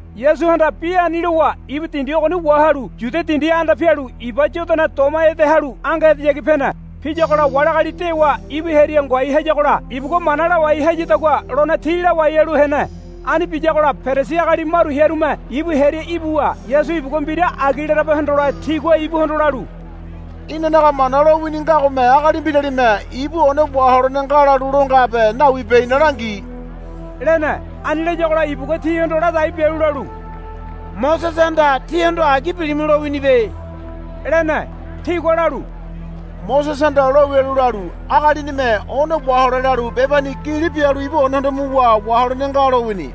Yasuhanda bi ani lowa ibu dindi ogoni wahalu Yudia dindi anda pialu iba Yodana doma ede halu ange edeyagi pene. Piyagola wali agali dewa ibu hearia ngoai hayagola ibugua mana lawai hayadagua lone ti lawai halu hene. Ani biyagola Perisi agali maru hearume ibu hearia ibuwa Yasu ibugua mbira agi larabe hondole tigua ibuhondo lalu, Inanaga Mana lowini ngagome agali mbiralime ibu one waholene nga lalu lo ngabe nawibe ina langi, lene. Ani layagola ibugua tihondo ladai bialu lalu, Mosesehanda tíhondo agi bilimu lowinibe, lene. Tigua lalu, Mosesehanda lo wialu lalu, Agalinime one wahole lalu bebani gili bialu ibu onehondo muwa waholene nga, lowini,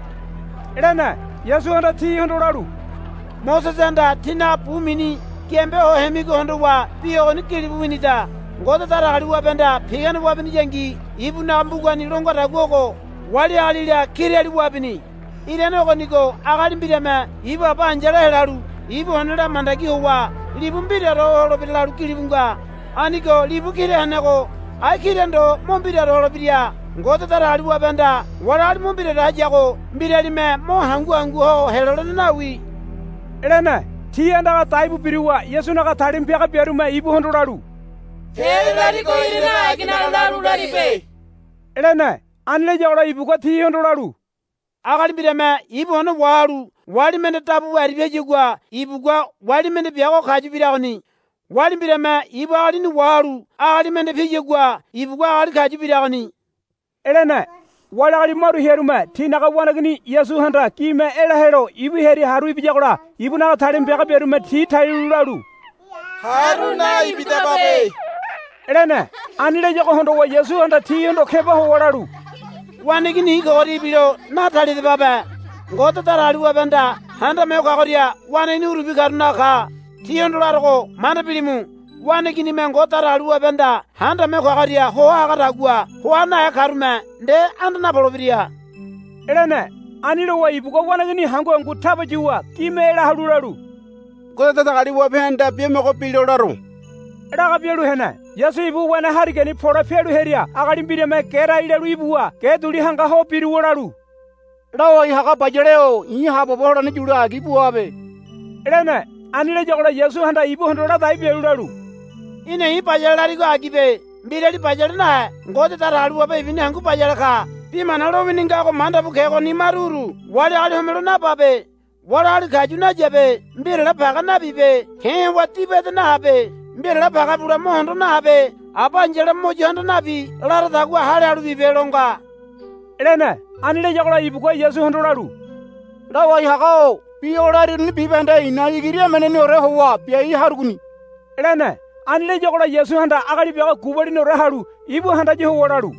lene. Yasuhanda tihondo lalu, Mosesehanda tínaga bu mini giambe ho hemigo hondowa bi ogoni gilibu winida. Ngode Datagaliwabehanda pigane wabiyangi ibunaga mbugani lo ngadagua ogo, Wali agalila kirali wabini. Irane ogonigo agali mbirame ibu aba ai̱yala helalu ibu onela mandagi howa libu mbiraore ho holebira, lalu gilibu nga. Anigo libu kira henego ai kira ndo mo mbiraore holebira. Ngode Datagaliwabehanda wali agali mo mbiraore hayago mbiralime mo hangu hangu ho helolene nawi, lene. Ti andaga daibu biruwa Yasunaga talima piaga biarume ibuhondo lalu, Te larigo irane aginaga lalu laribe, lene. Ani layagola ibugua tihondo lalu, Agali mbirame ibu one wahalu wali mende dabu bu aribia hayagua ibugua wali mende biago kayu biragoni. Wali mbirame ibu agalini wahalu agali mende piyagua ibugua agali kayu biragoni, lene. Wali agali maru hearume tinaga waneigini Yasuhanda gime ela helo ibu hearia haru ibiyagola ibunaga talima piaga biarume ti talialu lalu, Haru naibidababe, lene. Ani layago hondowa Yasuhanda tihondo keba howa lalu, Waneigini i̱ kogoria ibilo natalidababe. Ngode Datagaliwabehanda Handame Ho Kagoria waneigini urubi karunaga ka. Tíhondo larogo manda bilimu. Waneiginime Ngode Datagaliwabehanda Handame Ho Kagoria hoa hagadagua hoa nahe karume nde anda napolebira, lene. Ani lowa ibugua waneigini hangu hangu taba yuwa gime ela halu lalu, Ngode Datagaliwabehanda biamogo bilo laro, laga bialu hene. Yasu ibu wene harigani pole pialu hearia agali mbirame gerai lalu ibuwa ge duli hanga ho biruwa lalu, Lawai haga bayale-o i̱ haabobo holene yule agi buabe, lene. Ani layagola Yasuhanda ibuhondo ladai bialu lalu, Í̠na i̱ bayale larigo agibe. Mbirali bayale nahe Ngode Datagaliwabe ibuni hangu bayale ka. Bi mana lowini ngago manda bu kegoni maru uru, Wali agali homelo nababe. Wali agali kayu nayabe. Mbirale page nabibe. Ke̱ howa diba ede nahabe. Mbirale page bule mo hondo nahabe. Aba ai̱yala mo yo handa nabi laradagua hale halu bibe, lo nga, lene. Ani layagola ibugua Yasuhondo lalu, Lawai haga-o bi o lariruni bibahende i̱na igiri emeneoreni howa biai harugoni, lene. Ani layagola Yasuhanda agali biago gubaliniore halu ibu handaya howa lalu,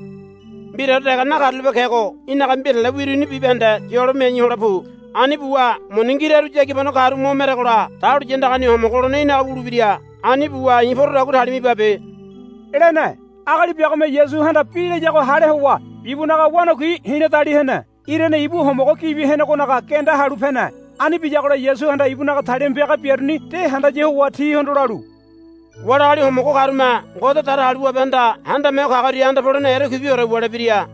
Mbiraore dege nakarulape kego í̠naga mbirale wiruni bibahende yolo miai hole pu. Ani buwa muni ngiraru yagibano karu mo meregola dahuliya andagani homogo holene í̠naga wulebira. Ani buwa i̱ porodagua talima ibabe, lene. Agali biagome Yasuhanda bi layago hale howa ibunaga wanakui hi̱la dali hene. Irane ibu homogo gibi henegonaga genda halu pene. Ani biyagola Yasuhanda ibunaga talima piaga biaruni de handaya howa tihondo lalu, Wali agali homogo karume Ngode Datagaliwabehanda Handame Ho Kagoria anda polene erekuibiore wulebira,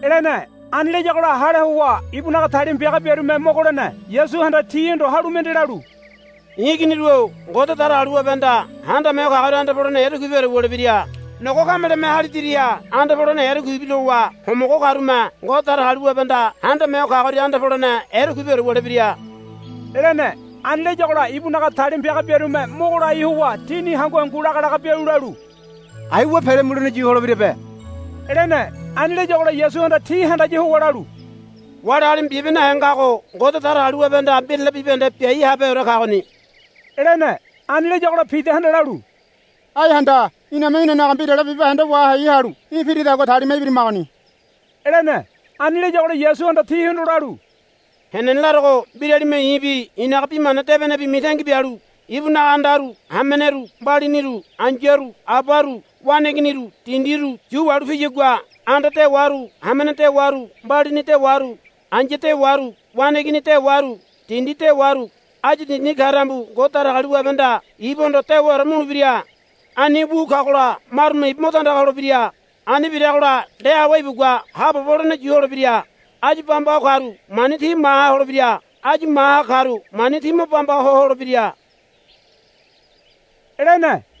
lene. Ani layagola hale howa ibunaga talima piaga biarume mogo lene. Yasuhanda tihondo halu mende lalu, I̱ iginiru-o Ngode Datagaliwabehanda Handame Ho Kagoria anda polene erekuibiore wulebira. Nogo kameleme háli diriha anda polene erekuibi lowa homogo karume Ngode Datagaliwabehanda Handame Ho Kagoria anda polene erekuibiore wulebira, lene. Ani layagola ibunaga talima piaga biarume mogo lai howa tini hangu hangu laga laga bialu lalu, Aiwa pele mulene yu holebirabe, lene. Ani layagola Yasuhanda ti handaya howa lalu, Wali agalime bibe nahe ngago Ngode Datagaliwabehanda mbirale bibahende biai habeheore kagoni, lene. Ani layagola Pidahanda lalu, Ai handa. Iname inanaga mbirale bibahende wahai halu í̠ piridagua talima ibirimagoni, lene. Ani layagola Yasuhanda tihondo lalu, Henene larogo mbiralime i̱bi i̱naga bi mana debenebi mitangi bialu ibunaga andaru hameneru mbalibuniru ai̱yaru abaru waneiginiru dindiru yu wahalu piyagua anda dewaru hamene dewaru mbalibuni dewaru ai̱ya dewaru waneigini dewaru dindi dewaru áyu dindini ka tambu Ngode Datagaliwabehanda ibuhondo dewaore mulebira. Ani wu kagola marume ibu mo tandaga holebira. Ani biragola nde awe ibugua haabobo holene yu holebira. Áyu bamba ho karu mani ti maha holebira. Áyu maha karu mani ti mo bamba ho holebira, lene.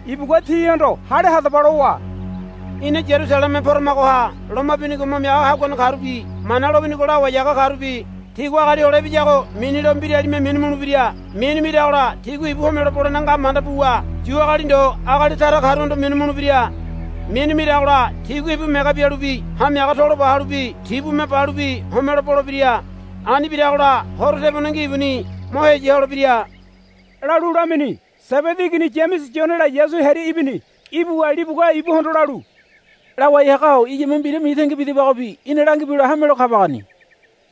Ibugua tihondo, Hale hadaba, lowa, Ina Yarusaleme poramagoha loma binigo mo miaga haguane karubi Mana lowinigo lawai haga karubi tigua Agali Hole Ibiyago minilo mbiralime minu mulebira. Minu miragola tigua ibu homelo bolene nga manda buwa Yu agali ndo agali tara karuhondo minu mulebira. Minu miragola tigua ibu mege bialubi hamiaga tolo ba halubi tibume balubi homelo bolebira. Ani biragola horo tebonengi ibuni mo heya holebira, lalu lamini. Sebedi igini Yamese Yonela Yasu hearia ibini. Ibuwa libugua ibuhondo lalu, Lawai haga-o iyame mbira mitangi bidabagobi í̠na langibelo hamelo kabagoni,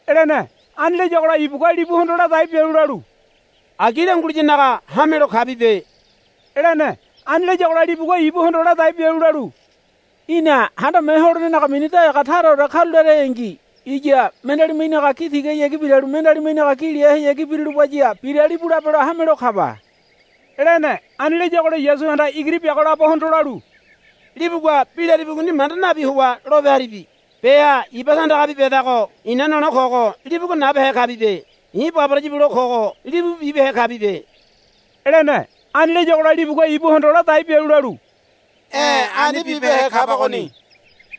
lene. Ani layagola ibugua libuhondo ladai bialu lalu, Agi languliyanaga hamelo kabibe, lene. Ani layagola libugua ibuhondo ladai bialu lalu, Í̠na Handame Ho Holenenaga mini daliga taraore karularengi iya mendealime í̠naga gi tigahayagi biralu mendealime í̠naga gi lehayagi birulubaya biralibu labelo hamelo kaba, lene. Ani layagola Yasuhanda igiri biago labohondo lalu, Libugua bi laribigoni manda nabi howa lope haribi. Beha iba tandagabi bedago i̱na nole kogo libugua nabehe kabibe. I̱ baboraya bule kogo libu bibehe kabibe, lene. Ani layagola libugua ibuhondo ladai bialu lalu, E̱ ani bibehe kabagoni,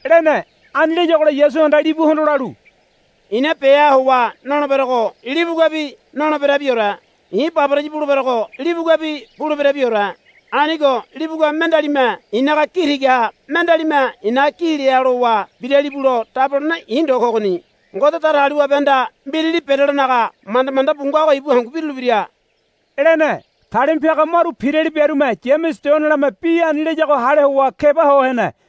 lene. Ani layagola Yasuhanda libuhondo lalu, I̱na beha howa noleberogo libuguabi noleberabiore. I̱ baboraya buleberogo libuguabi buleberabiore. Anigo libugua mendealime i̱naga gi tigaha mendealime i̱naga gi leha lowa biralibulo dabolene i̱ ndo kogoni. Ngode Datagaliwabehanda mbirali berelonaga manda manda bu ngago ibu hangu birulebira, lene. Talima piaga maru pirali biarume Yamese Yonelame bi ani layago hale howa keba ho hene.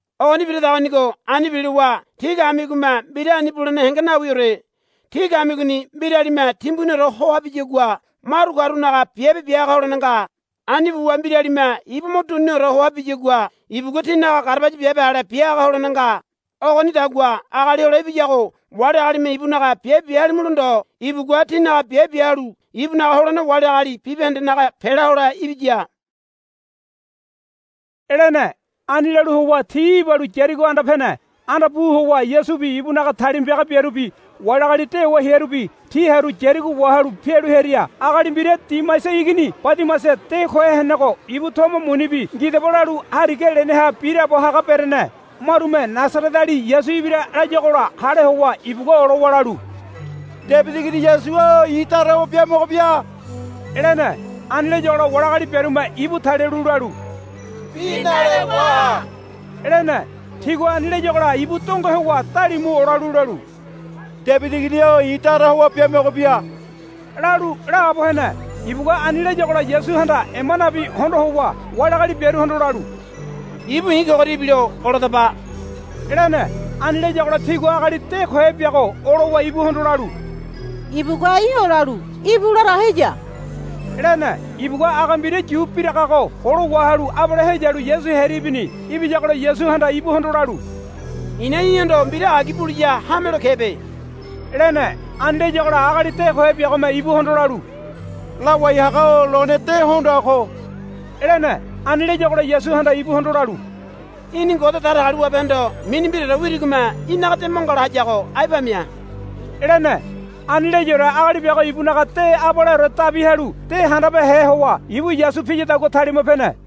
Ogoni biradagonigo ani bilowa tí kamigome mbira ani bulene henge nawiore. Tí kamigoni mbiralime timbuniore hoa biyagua maru karunaga biabe bia haga holene nga. Ani buwa mbiralime ibu mo duniniore hoa biyagua ibugua tinaga garabaya biabe ale bia haga holene nga. Ogonidagua Agali Hole Ibiyago wali agalime ibunaga biabe bia halimulo ndo ibugua tinaga biabe bia halu ibunaga holene wali agali bibahendenaga pela hole ibiya, lene. Ani lalu howa ti ibalu Yarigo anda pene. Anda pu howa Yasubi ibunaga talima piaga biarubi wali agali dewa hearubi ti haru Yarigo wahalu pialu hearia agali mbira Dimaisa igini Badimaisa de kohe henego ibu tomo munibi ngidaba lalu hariga leneha biraabo haga berene. Marume, Nasareteali Yasu ibira, layuagola hale howa ibugua olowa lalu, Debidi igini Yasu-o i̱ dara howa biamogo bia, lene. Ani layagola wali agali biarume ibu talialu lalu, Bi nale waha, lene. Tigua ani layagola ibu donge howa dalimu olalu lalu, Debidi igini-o i̱ dara howa biamogo bia, lalu laabo hene. Ibugua ani layagola Yasuhanda ema nabi hondo howa wali agali biaruhondo lalu, Ibu i̱ kogoria ibilo oladaba, lene. Ani layagola tigua agali de kohe biago olowa ibuhondo lalu, Ibugua í̠ olalu íbu larago heya, lene. Ibugua aga mbira yu biragago golo wahalu abale heyalu Yasu hearia ibini. Ibiyagola Yasuhanda ibuhondo lalu, I̱na í̠hondo mbira agi buliya hamelo kebe, lene. Ani layagola agali de kohe biagome ibuhondo lalu, Lawai haga-o lone de hondoa ko, lene. Ani layagola Yasuhanda ibuhondo lalu, Í̠ni Ngode Datagaliwabehondo mini mbiraore wirigome í̠naga de mo ngala hayago ai pamia, lene. Ani layaore agali biago ibunaga de abaleore dabi halu de handabehe howa ibu Yasu piyadagua talima pene.